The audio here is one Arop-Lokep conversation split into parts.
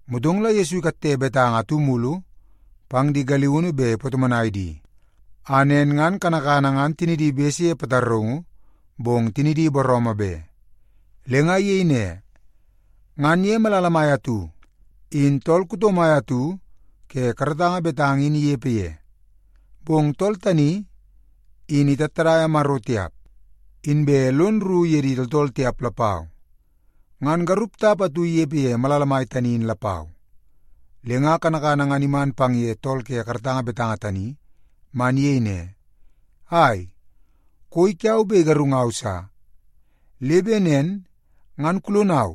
Motong la Yesu ikatte betanga atu mulu pang di galiunu bet ipatomonai di, a nen ngan kanakana ngan tinidi bese ye pataraungu, bong tinidi booroomoo be. Le nga iyei ne, “Ngan ye malala mai atu, in tool kuto mai atu ke karatanga betanga in inepe ye. Bong tool tani, in itattadaia Maro tiap, inbe lono rru ye di tooltool tiap lapau. Ngan garup tap atu inepe ye malala mai tani in lapau, le nga kanakana ngan iman pang ye tool ke karatanga betanga tani man iyei ne, ‘Ai, koi kiau bet igarungau sa, le bet nen ngan kulonau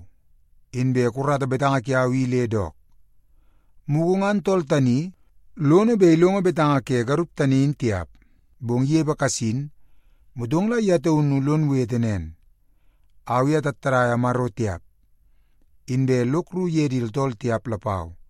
inbe kukarata betanga kiau i le dook.’ “Mugu ngan tool tani lono bet ilongo betanga ke garup tani in tiap, bong inepe kasin, motong la ye taunu lon wete nen, ‘Au i atattadaia Maro tiap, inbe lok rru ye di tooltool tiap lapau,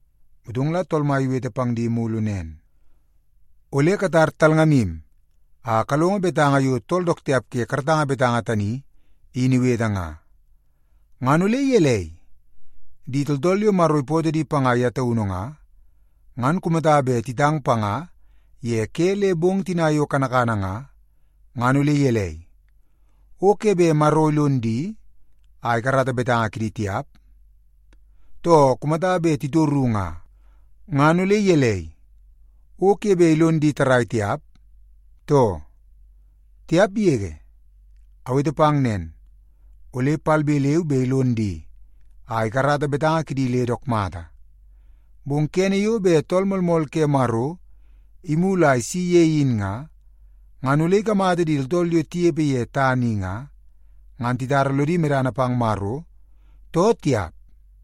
Motong la Tool Mai iwete pang di mulu nen, “Ole katar talngamu a kalongo betanga yo tool dook tiap ke karatanga betanga tani in iwete nga. Ngan ole gelei? Di tooltool yo Maro ipootoo di panga ye taunu nga, ngan kumata bet titang panga ye ke le bong tina yo kanakana nga, ngan ole gelei, o ke bet Maro ilon di a ikarata betanga kidi tiap? Too, kumata bet titoru nga, ngan ole gelei, o ke bet ilon di tarrai tiap, too? Tiap yege! Awete pang nen, ole palbe leu be ilon di a ikarata betanga kidi le dook mata. Bong kene yo bet Tool Moolmool ke Maro imulu a isi ye in nga, ngan ole ikamata di tooltool yo tinepe ye tana i nga, ngan titara lodi medana pang Maro, too tiap?”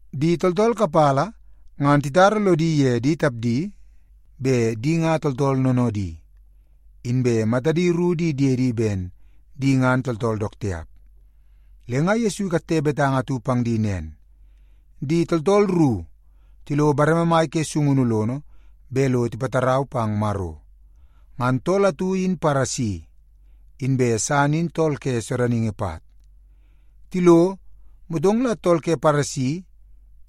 Di tooltool kapala ngan titara lodi ye di tapdi bet di nga tooltool noonoodi, inbe matadi ru di diedi ben di ngan tooltool dook tiap. Le nga Yesu ikatte betanga atu pang di nen, “Di tooltool ru tilo bareme mai ke sungunu lono bet lo tipatarau pang Maro. Ngan tool atu in Paresi, inbe san in tool ke sodaningi pat. Tilo, motong la tool ke Paresi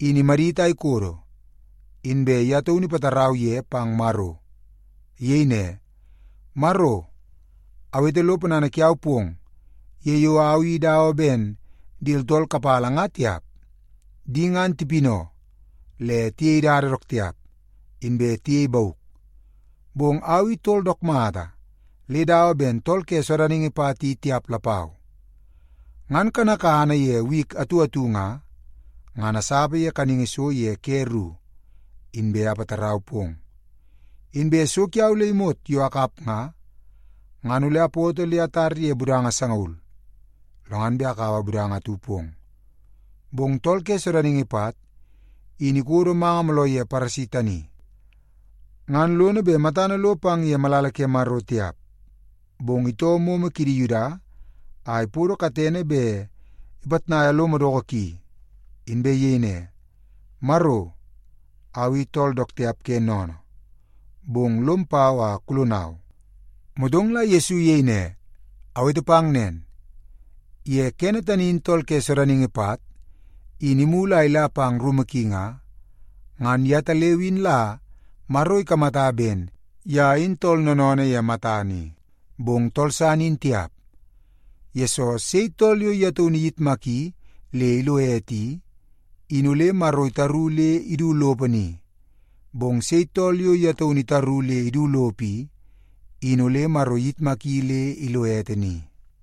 in imadit a ikodo, inbe ye taunu ipatarau ye pang Maro. Iyei ne, ‘Maro, awete lo ponana kiau pong ye yo au i dawa ben di tooltool kapala nga tiap. Di ngan tipinau, le tiyei dada dook tiap, inbe tiyei bauk. Bong au i tool dook mata le dawa ben tool ke sodaningi pat i tiap lapau. Ngan kanakana ye wik atu atu nga, ngan asapa ye kaningi so ye ke ru, inbe apatarau pong. Inbe so kiau le imot yo akap nga, ngan ole apoto le atar ye budanga sangaul, lo ngan bet akaua budanga atu pong.’ “Bong tool ke sodaningi pat in ikodo manga mooloo ye Paresi tani, ngan lono bet matana lo pang ye malala ke Maro tiap. Bong itoo momo kidi Yuda a ipodo katene bet ipitnaia lo madoko ki, inbe iyei ne, ‘Maro, au i tool dook tiap ke sennene, bong lom pau a kulonau.’” Motong la Yesu iyei ne, “Awete pang nen. Ye kene tani in tool ke sodaningi pat in imulu a ila pang rumu ki nga, ngan yetaleu in la Maro ikamata ben ye in tool noonoonoo ye matana i. Bong tool san in tiap, yesoo sei tool yo ye taunu iyitmaki le ilo ete i, in ole Maro itaru le idu lopo ni. Bong sei tool yo ye taunu itaru le idu lopo i, in ole Maro iyitmaki le ilo ete ni.”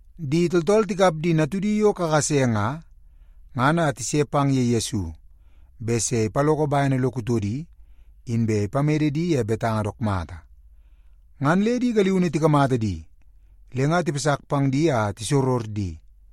Di tooltool tikap di natudi yo kakase nga, ngan a tise pang ye Yesu bet se ipaloko bene lo kutodi, inbe ipamede di ye betanga dook mata. Ngan le di galiunu tikamata di, le nga tipasak pang di a tisoror di.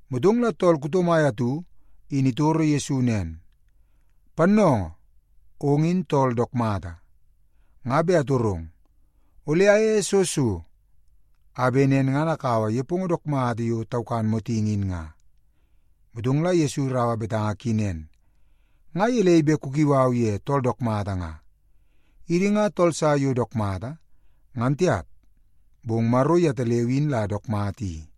Motong la tool kuto mai atu in itoro Yesu nen, “Pannoongoo, ong in tool dook mata. Nga bet atorong, ole ayeie soo so, a bet nen ngan akaua nepongo dook mata yo taukan motingi in nga?” Motong la Yesu iraua betanga ki nen, “Nga gelei bet kukiu au ye tool dook mata nga? Idi nga tool sa yo dook mata, ngan tiap, bong Maro yetaleu in la dook mata i.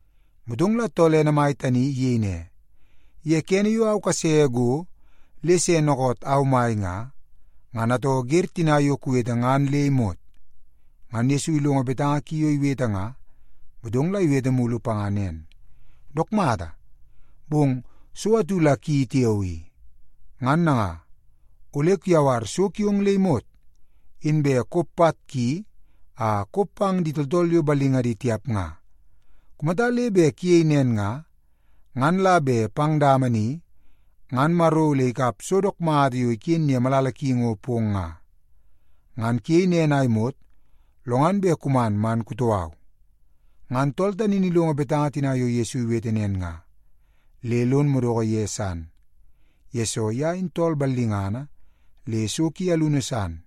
Motong la tool ene mai tani iyei ne, “Ye kene yo au kase go le se dookoot au mai nga, ngan atoo wer tina yo kuwete ngan le imot.” Ngan Yesu ilongo betanga ki yo iwete nga, motong la iwete mulu panga nen, “Dook mata, bong so atu la kuyeii tiao i. Ngan nanga, ole kuyawar so kiong le imot, inbe kop pat ki a kop pang di tooltool yo ballingadi tiap nga. Kumata le bet kuyei nen nga, ngan la bet pang dama ni ngan Maro ole ikap so dook mata yo iken ye malala ki ngo pong nga. Ngan kuyei nen a imot, lo ngan bet kuman man kutoo au.” Ngan tool tani ilongo betanga tina Yesu iwete panga nen nga, ngan le lon madoko ye san, yesoo ye in tool ballingana le so ki alunu san.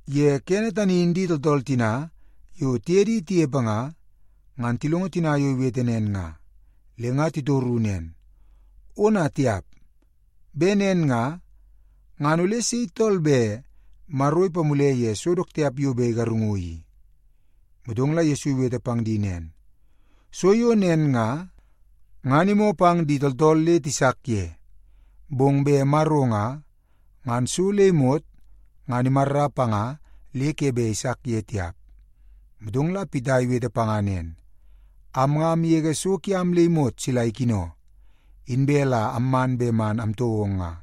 Ye kene tani in di tooltool tina yo tiye di tinepe nga, ngan tilongo tina yo iwete nen nga, le nga titoru nen, “Ona tiap! Bet nen nga, ngan ole sei tool bet Maro ipamule ye so dook tiap yo bet igarungu i?” Motong la Yesu iwete pang di nen, “So yo nen nga, ngan imoo pang di tooltool le tisak ye. Bong bet Maro nga, ngan so le imot ngan imarra panga le ke bet isak ye tiap.” Motong la Pita iwete panga nen, “Am nga amgege so kiam le imot sila ikino, inbe la amman bet man amtoo ong nga.”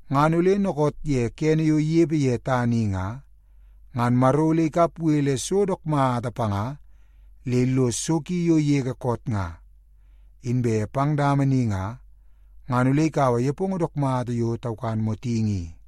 ngan ole dookoot ye kene yo inepe ye tana i nga, ngan Maro ole ikap bele so dook mata panga le illos so ki yo igege koot nga. Inbe pang dama ni nga, ngan ole ikaua nepongo dook mata yo taukan motingi i.”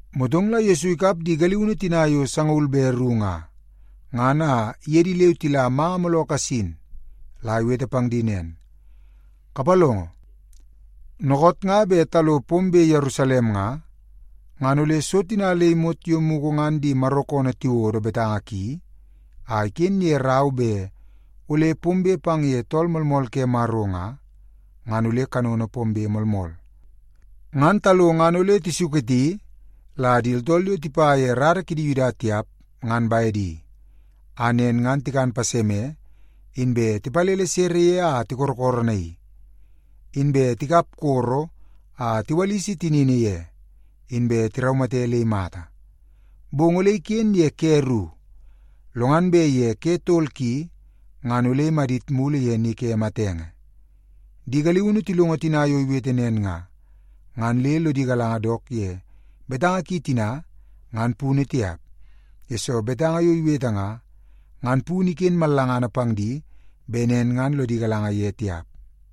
Motong la Yesu ikap di galiunu tina yo sangaul be ru nga, ngan a iye di leu tila manga mooloo kasin la iwete pang di nen, “Kapalongo, dookoot nga bet talo pombe Yerusalem nga, ngan ole so tina le imot yo mugu ngan di Maro koonoo tiwodo betanga ki a iken ye rau bet ole pombe pang ye Tool Moolmool ke Maro nga, ngan ole kanono pombe moolmool. Ngan talo ngan ole tisuketi la di tooltool yo tipa ye rara kidi Yuda tiap ngan bedi, a nen ngan tikan paseme, inbe tipalele sere ye a tikorokoronaii. Inbe tikap koro a tiwalisi tinini ye, inbe tiraumate le imata. Bong ole iken ye ke ru, lo ngan bet ye ke tol ki ngan ole imadit mulu ye ni ke matenge.” Di galiunu tilongo tina yo iwete nen nga, ngan le lodi galanga dook ye betanga ki tina ngan punu tiap, yesoo betanga yo iwete nga, ngan punu iken mallangana pang di bet nen ngan lodi galanga ye tiap.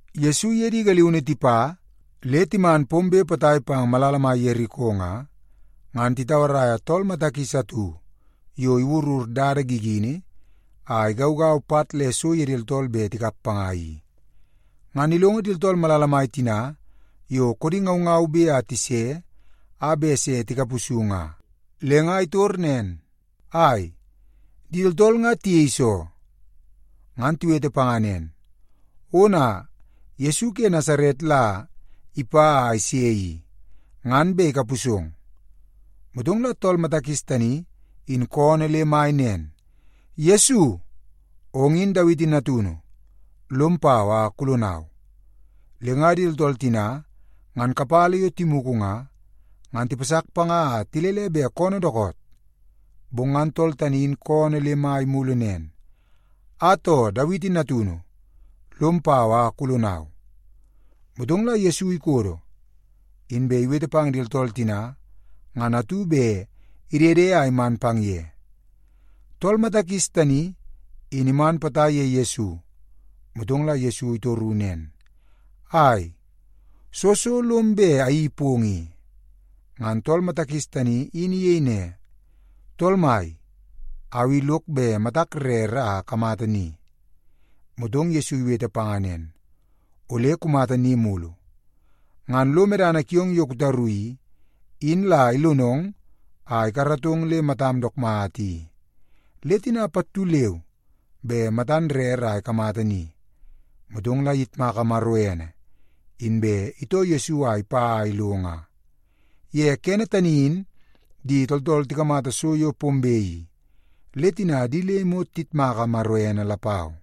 Yesu iye di galiunu tipa le timan pombe potai pang malala mai Yeriko nga, ngan titauarai tool mata kis atu yo iwurur dada gigini a igaugau pat le so ye di tooltool bet tikap panga i. Ngan ilongo di tooltool malala mai tina yo koodi ngaungaube a tise a bet se tikapusu nga. Le nga itor nen, “Ai, di tooltool nga tiyei soo?” Ngan tiwete panga nen, “Ona, Yesu ke Nasaret la ipa a ise i, ngan bet ikapusong.” Motong la tool mata kis tani in koonoo le mai nen, “Yesu, ong in Dawiti natunu. Lom pau a kulonau!” Le nga di tooltool tina ngan kapala yo timugu nga, ngan tipasak panga a tilele bet koonoo dookoot. Bong ngan tool tani in koonoo le mai mulu nen, “Atoo, Dawiti Natunu, lom pau a kulonau!” Motong la Yesu ikodo, inbe iwete pang di tooltool tina ngan atu bet idede a iman pang ye. Tool mata kis tani in iman potai ye Yesu, motong la Yesu itoru nen, “Ai, soo so lom bet ayeii pong i?” Ngan tool mata kis tani in iyei ne, “Tool Mai, au i lok bet matak rere a akamata ni.” Motong Yesu iwete panga nen, “Ole kumata ni mulu. Ngan lo medana kiong yo kutaru i, in la ilonong a ikaratong le matam dook mata i.” Le tina pattu leu be matan rere a ikamata ni, motong la iyitmaka Maro ene, inbe itoo Yesu a ipa a ilo nga. Ye kene tani in di tooltool tikamata so yo pombe i, le tina di le imot tiyitmaka Maro ene lapau.